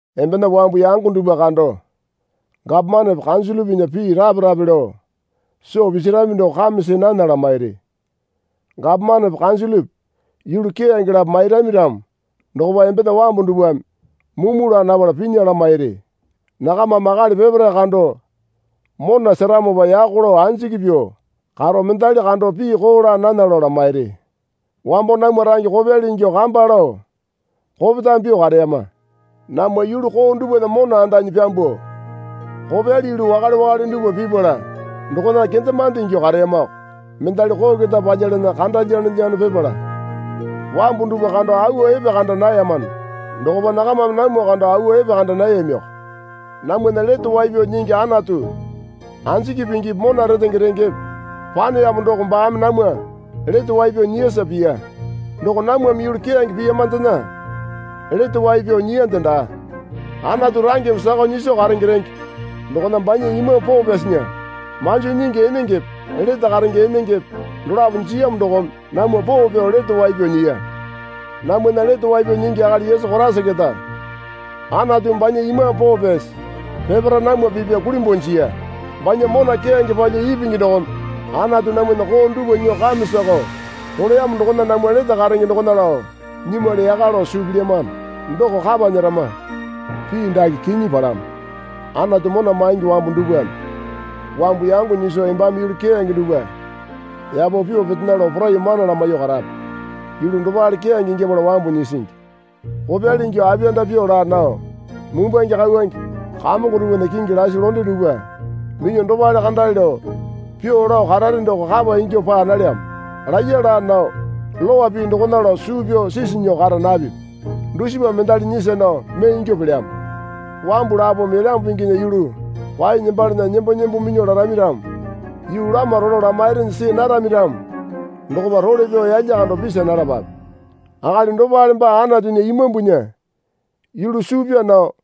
Embena wambu yango dupwa kando gapomanepe kanjilipinya pii rape rape lao soo pisirami doko kame see nana lamairi. Gapomanepe kanjilipi yulu keyange lapo mairami ramo dokopa embena wambu dupwame mumu laa napala pinya lamairi. Nakamame akali peparae kando mona seramopa yako lao anjiki pyuo karo mendali kando pii koo laa nana lao lamairi. Wambo namwa range kopyali ingyuo kamba lao kopetame pyuo kareyama. Namwa yulu koo dupwana mona andanyi pyambuo kopyali yulu wakale wakale dupwa pipala dokona kendemande ingyuo kareyamako. Mendali koo keta palyalana kanda lyanolyano pipala wambu dupwa kando awa epekanda nayamano dokopa nakamame namwa kando awa epekanda nayamiyoko. Namwana Lete Wai Pyao Nyingi Anatu anjiki pingipi mona retenge rengepe paneyamo doko baame namwa lete wai pyao nyiyasa piya. Doko namwame yulu keyange piyamandena lete wai pyao nyiyande daa. Anatu rangena sakao nyiso karenge renge dokona banya Imambu Poo Pyasinya manjo nyingi enengepe lete karenge enengepe dolapo jiyamo dokome namwa poo pyao lete wai pyao nyiya. Namwana Lete Wai Pyao Nyingi akali Yesu Koraisa keta Anatumi banya Imambu Poo Pyasi peparae namwa pipya kulimbuo jiya. Banya mona keyange palyuo ipingi dokome Anatu namwana koo dupwa nyuo kame sakao roleyamo dokona namwa lete karenge dokona lao nyimwali yaka lao suu pilyamano doko kapa nyerama. Pii dake kinyi palamo. Anatu mona maingi wambu dupwame wambu yango nyiso embame yulu keyange dupwa yapo pyuo petena lao poraiyuo mana lamaiyuo karape. Yulu dopale keyange ingyapala wambu nyisingi. Kopyali ingyuo apiyanda pyuo laa nao mumbwange kauwange kamongo dupwana kingi lasi londe dupwa minyuo dopale kandale lao pyuo lao karare doko kapa ingyuo paa nalyamo. Laiya laa nao Lowa pii dokona lao suu pyao sisi nyuo kara napipi. Dusipame mendali nyisa nao mee ingyuo pelyamo. Wambu lapome Elyambu Pinginya yulu kwaenyi nembalana nembo nembo minyuo larami ramo yuu lama rolo lamairinyi see narami ramo dokopa role pyao yalya kando pisa nalapape. Akali dopale baa Anatunya Imambunya yulu suu pyaa nao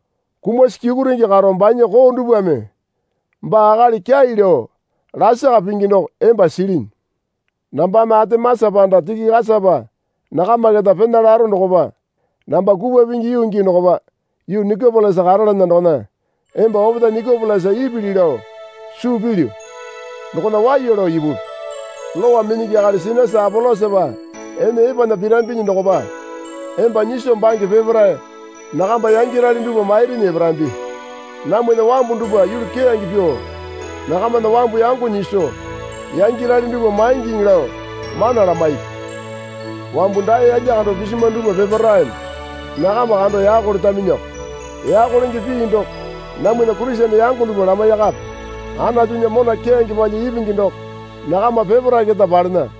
kumasi kyukurenge karo banya koo dupwame baa akali kyai lao lasaka pingi doko emba silinyi. Nambame Atemasa panda Tikikasapa nakama keta pena laro dokopa namba kupwa pingi yuu gii dokopa yuu Nikopolisa karalana dokona emba opetae Nikopolisa ipili lao suu pilyu dokona waiya lao ipupi. Lowa minyingi akali Sinasa Apolosapa ene epena pirambinyi dokopa emba nyiso bange peparae nakamba yangyarali dupwa mairinyi eparambi. Namwana wambu dupwa yulu keyange pyuo nakamana wambu yango nyiso yangyarali dupwa maingiŋi lao mana lamaipi. Wambu dae yalya kando pisimwa dupwa peparaeme nakama kando yako letaminyiko. Yako lenge pii doko namwana Kurisene yango dupwa lamaiyakape. Anatunya mona keyange palyuo ipingi doko nakama peparae keta palena.